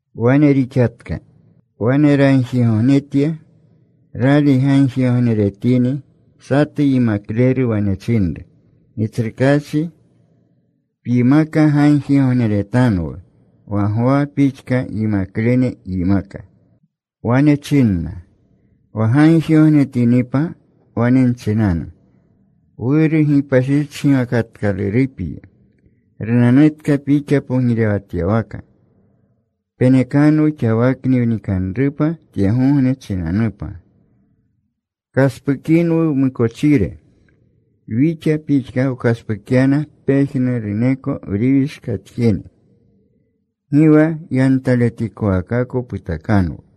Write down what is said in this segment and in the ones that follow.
Wane rixatka. Wane ragjigognetya. Rali gagjigogneretini, satu yimakleru wane chinru, “Gitsrukaachi, pyimaka gagjigogneretanwu, wa Gwa pixka yimaklene yimaka.” Wane chinna, “Wa gagjigognetinipa, wane nchinanu: Wuru, gipashichgiwakatkalurupyi. Runanutka Pixa pogirewatyawaka. Penekanwu xawakni wnikanrupa tyegogne chinanupa. Pkaspukinwu wmukochire, wixa pixka wkaspukyana pejnuruneko wriwishkatjene. Gi wa yantaletikowakako putakanwu.”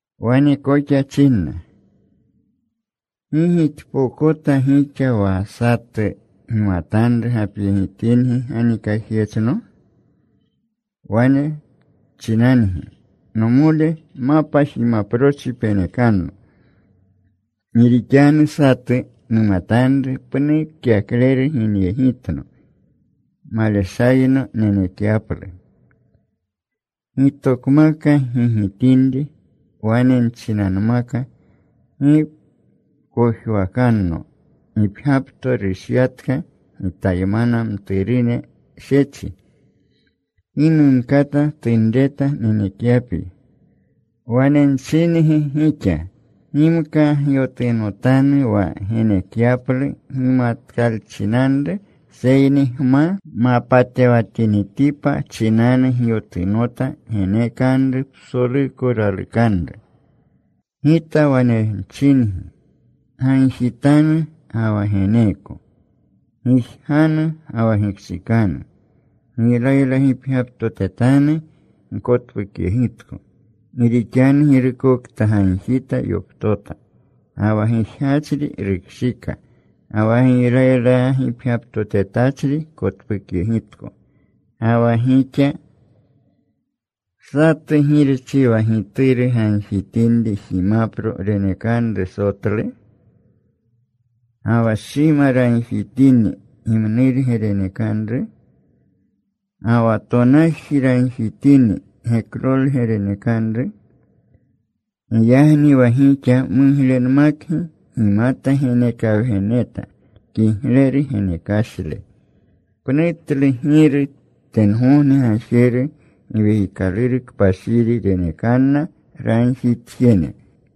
Wane koxa chinna, “¿Gi gixpokota gixa wa satu gimatanru gapyegitingi ganikajyechno? Wane chinangi, ‘Nomole, mapa jimaprochi penekanno. Gi rixanu satu numatanru, pnu kyakleru, ginyegitno. Maleshayno nenekyaplu.’ “Gitokmaka gigitinri. Wane nchinanmaka, ‘Gi pkojwakanno. Gipgyapto rushyatka. Gitaymana mturune shechi. Gi numkata tunreta nenekyapyi.’ “Wane nchingi gixa, gimka gyotunotanu wa genekyaplu gimatatkalchinanru. Seyni gma mapatewatinitipa chinanu gyotunota. Genekanru psoluko ralukanru. “Gita wane chingi, gagjitanu ga wa geneeko. Gijganu ga wa gikshikanu. Giylaylagipgyaptotetanu. Gkotpukyegitko. Gi rixanu girukokta gagjita, yoptota. Ga wa gijgachri rukshika. Ga wa giylaylagipgyaptotetachri kotpukyegitko. “Ga wa gixa ¿satu girchi wa gituru gagjitinri jimapro renekanru sotlu? ¿Ga wa shima ragjitini, gimnurge renekanru? ¿Ga wa tonaji ragjitini, geklorge renekanru? Giyagni wa gixa muglenmakgi gimata genekawgeneta kigleru genekashle, pnutlu Giru tengogne Gajeru Giwekikaluru Kpashiri renekanna ragjitjene.”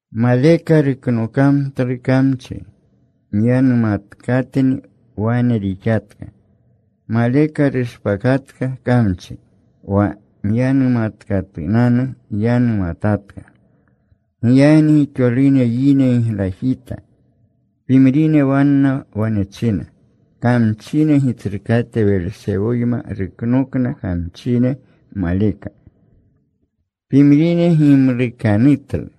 Maleka ruknokamtlu kamchi. Myanumatkatni. Wane rixatka. Maleka rushpakatka kamchi, wa myanumatkatunanu yanumatatka. Giyagni gixolune yine giglajita. Pimrine wanna wane china, “Kamchine gitsrukate Welsewoyma ruknokna kamchine maleka.” Pimrine gimlukanutlu.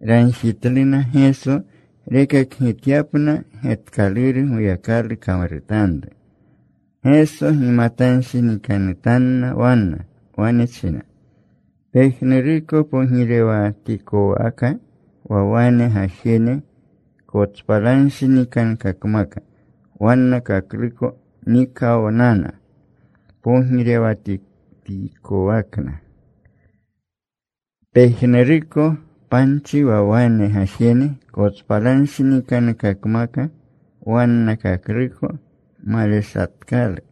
Ragjitluna Geso rekakgityapna getkaluru Goyakalu kamrutanru. Geso gimatanshinikanutanna wanna. Wane china, “Pejnuruko pogirewatikwaka wa wane gajene kotspalanshinikankakmaka wannakakluko, nikawnana pogirewatikwakna. Pejnuruko panchi, wa wane gajene kotspalanshinikankakmaka wannakakluko, maleshpatkalu.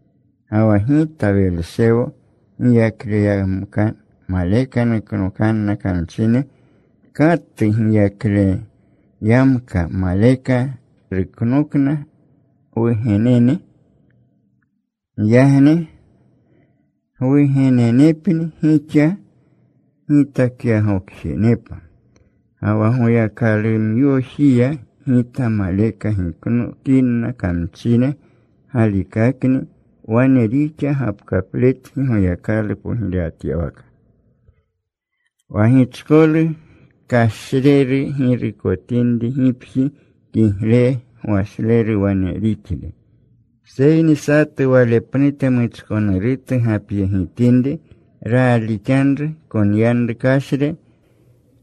Ga wa Gita Welsewo giyakleyamka maleka nuknokanna kamchine, ¿katu giyakleyamka maleka ruknokna gwugenene? Giyagni gwugenenepni gixa gitakyagokjenepa. Ga wa Goyakalumyojiya Gita maleka giknokinna kamchine, galikakni wane rixa gapkapletgi Goyakalu pogirewatyawaka. “Wa gichkolu kashreru girukotinri gipji, kigle gwashleru wane rixle. Seyni satu wale pnute muchkonurutu gapyegitinri, raalixanru, konyanru kashri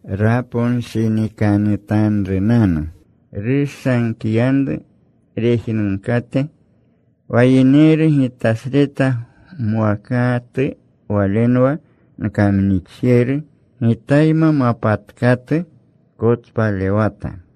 raponshinikanutanrunanu. Rushankiyanru rejnunkakate. “Wa yineru Gitasreta mwakatu walenwa nkamnixjeru. Gitayma mapatkatu, kotspalewata.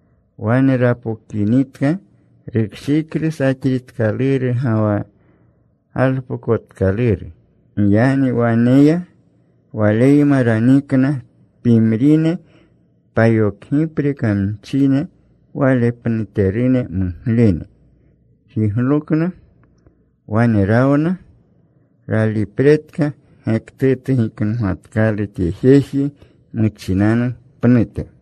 “Wane rapokinitka rukshiklu saxritkaluru ga wa galpokotkaluru. Giyagni wane ya. Waleyma ranikna pimrine payokgipre kamchine wale pnuterune muglene. Jiglokna. Wane rawna. Ralipretka gektutu giknogatkalu tye jeji muchinanu pnute.”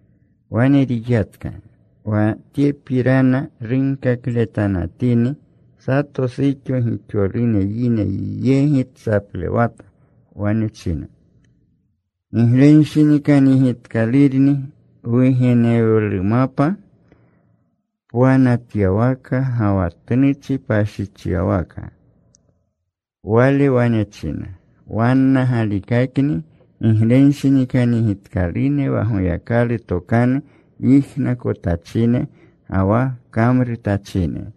Wane rixatka. Wa tyepirana runkakletanatini sato suxo gixolune yine yegi tsaplewata. Wane china, “Giglenshinikanyegitkalurni wugenewlumapa pwanatyawaka, ga wa tnuchi pashichyawaka.” Wale wane china, “Wanna galikakni giglenshinikanyegitkalune wa Goyakalu tokanu yijnakotachine ga wa kamrutachine.”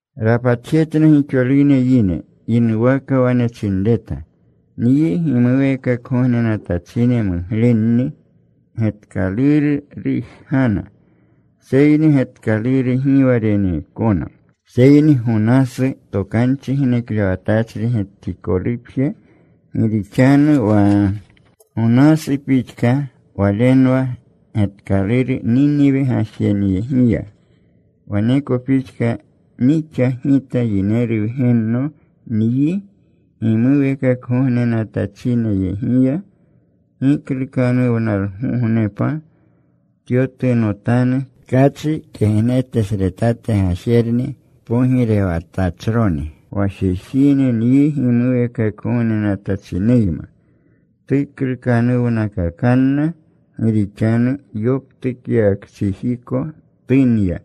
Rapatjetna gixolune yine. Yinuwaka wane chinreta, “Nyi gimuweekakgognenatachine muglenni getkaluru rujgana. Seyni getkaluru gi wa reneekona, seyni Gonasu tokanchi geneklewatachri getikolupje. Gi rixanu wa Gonasu pixka walenwa getkaluru Niniwe gajenyegiya, waneko pixka nixa Gita Yineru Wgenno nyi gimuweekakgognenatachinyegiya. Giklukanuwnalgognepa tyotunotanu tkachi kegnetesretate gajerni pogirewatachroni wa jejine nyi gimuweekakgognenatachineyma. Tuklukanuwnakakanna, gi rixanu yoptukyawakchijiko tunya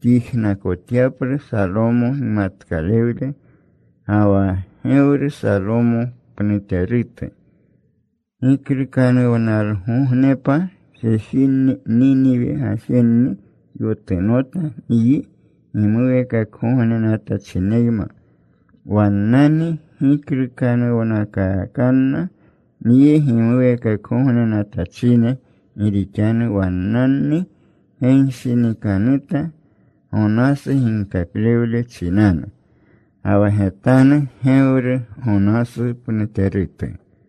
tyijnakotyaplu Salomo gimatkalewle. Ga wa gewru Salomo pnuterutu. Giklukanuwnalgognepa jejinni, Niniwe gajenni, yotunotanu nyi gimuweekakgognenatachineyma. Wannani giklukanuwnakakanna nyi gimuweekakgognenatachine. Gi rixanu wannani genshinikanuta Gonasu ginkaklewle chinanu. Ga wa getanru gewru Gonasu pnuterutu.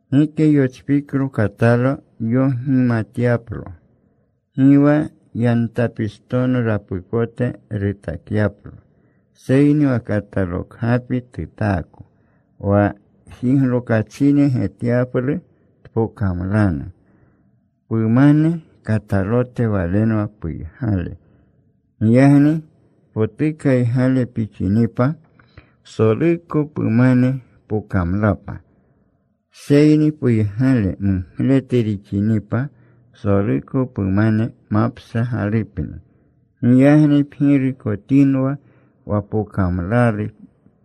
“Gike yochpiklo katalo yogimatyaplo, gi wa yantapistono rapukote rutakyaplo. Seyni wa katalo kgapi tutaako, wa jiglokachine getyaplu tpokamlanu. Pumane katalote walenwa puygale. Giyagni potukaygale pixinipa, psoluko pumane pokamlapa. Seyni puygale mugletu rixinipa, psoluko pumane mapshagalupni. Giyagni pgirukotinwa wa pokamlalu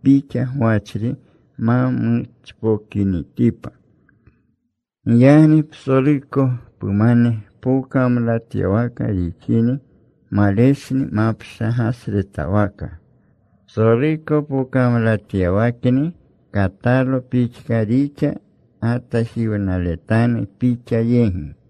pixa gwachri ma muchpokinitipa. Giyagni psoluko pumane pokamlatyawaka rixini, maleshni mapshagasretwaka, psoluko pokamlawatyawakni, katalo pixka rixa gatajiwnaletanu pixa yegi.”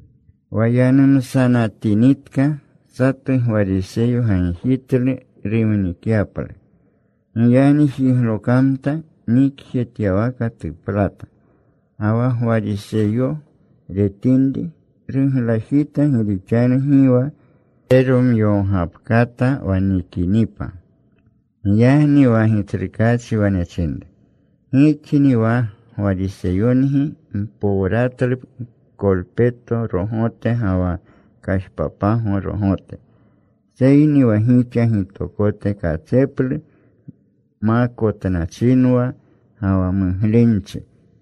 Wa yanumsatinitka, satu Gwariseyo gagjitlu rumnikyaplu. Giyagni jiglokamta. Nikjetyawaka tuplata. Ga wa Gwariseyo retinri, ruglajita gi rixanu gi wa reromyogapkata wa nikinipa. Giyagni wa Gitsrukaachi wane chinru, “Gixni wa Gwariseyongi mpowratlu kolpeto rogote ga wa kajpapago rogote, seyni wa gixa gitokote katseplu makotnachinwa ga wa muglenchi.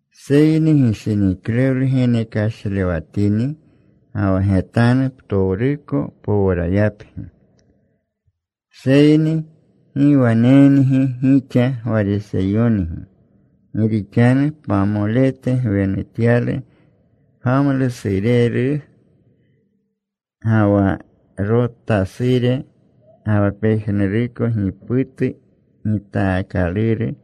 Seyni gishiniklewle geneklewashatini, ga wa getanu, ptowruko powrayapgi. “Seyni ¡gi wanengi gixa Gwariseyongi! Gi rixanu pamolete gwenutyalu pgamlusureru, ga wa rotasure, ga wa pejnuruko giputu gitaakaluru,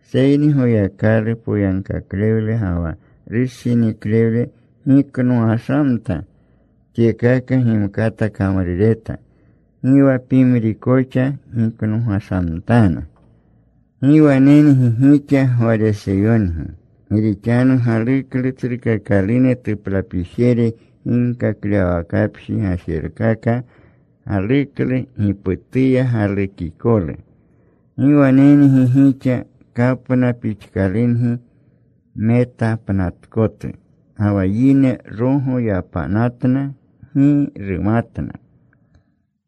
seyni Goyakalu poyagkaklewle ga wa rushiniklewle giknogashamta. Tyekaka gimkata kamrureta. Gi wa pimri koxa giknogashamtanu. “¡Gi wanengi gixa Gwariseyongi! Gi rixanu galuklu tsrukakalune tuplapijere ginkaklewwakapji gajerkaka. Galuklu giputuya galukikolu. ¡Gi wanengi gixa! Kapna pixkalungi, metapnatkotu, ga wa yine rogo yapanatna. Gi rumatna.”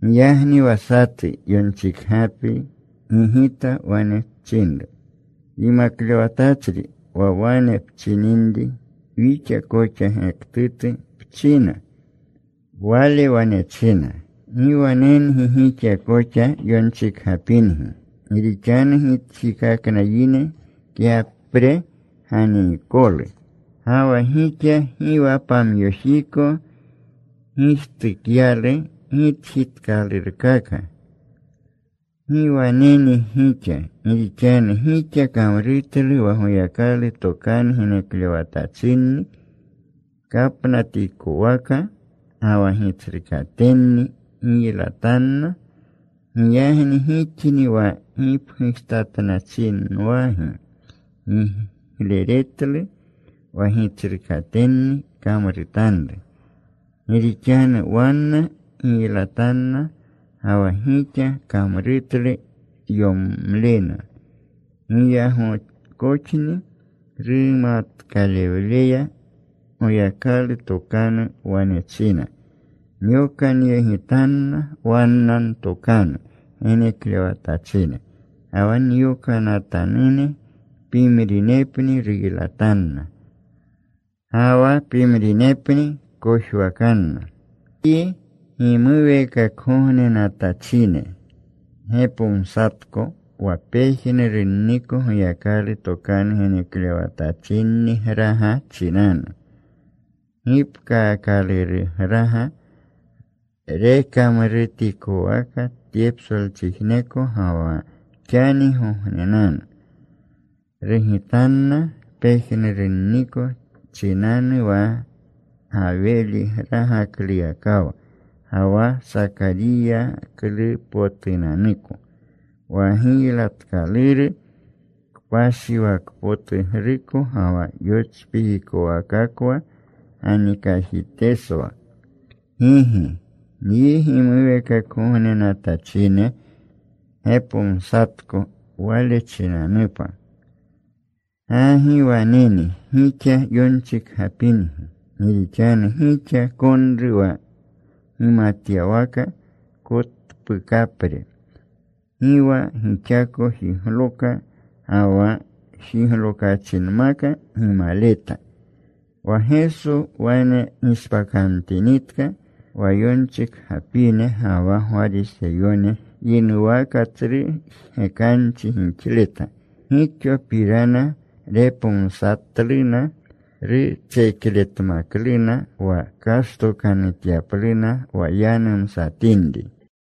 Giyagni wa satu yonchikgapri gigita. Wane chinru, “Yimaklewatachri, wa wane pchininri, wixa koxa gektutu pchina.” Wale wane china, “¡Gi wanengi gixa koxa yonchikgapingi! Gi rixanu gitjikakna yine kyapre ganiikolu. Ga wa gixa gi wa pamyojiko gijtukyalu gitjitkalurkaka. “¡Gi wanengi gixa! Gi rixanu gixa kamrutlu wa Goyakalu tokanu geneklewatachinni kapnatikowaka. Ga wa gitsrukatenni giylatanna. Giyagni gixni wa gipgujtatnachinwagi gigleretlu wa gitsrukatenni kamrutanru. Gi rixanu wanna giylatanna, ga wa gixa kamrutlu giyomlena. Giyagkoxni rumatkalewleya Goyakalu tokanu wane china, ‘Nyokanyegitanna wanna ntokanu geneklewatachine ga wa nyokanatanune. Pimrinepni ruylatanna. Ga wa pimrinepni kojwakanna.’ “Nyi gimuweekakgognenatachine gepomsatko wa pejnurunniko Goyakalu tokanu geneklewatachinnigraga chinanu, gipkaakalurugraga, rekamrutikowaka tye psolchijneko ga wa xangognenanu. Rugitanna pejnurunniko chinanu, wa Gawiligragakluyakawa ga wa Sakariyagragaklupotunanuko, wa giylatkaluru kpashiwakpotugruko ga wa yochpikikowakakwa ganikajiteswa. Gigi. Nyi gimuweekakgognenatachine gepomsatko wale chinanupa. “¡Gi waneni gixa yonchikgapingi! Gi rixanu gixa konru wa gimatyawaka kotpukapre. Gi wa gixako jigloka. Ga wa jiglokachinmaka gimaleta.” Wa Geso wane gishpakamtinitka, wa yonchikgapine ga wa Gwariseyone yinuwaka tsru jgekanchi gixleta. Gixopirana repomsatluna. Rutsekletmakluna, wa kashtokanutyapluna wa yanumsatinri.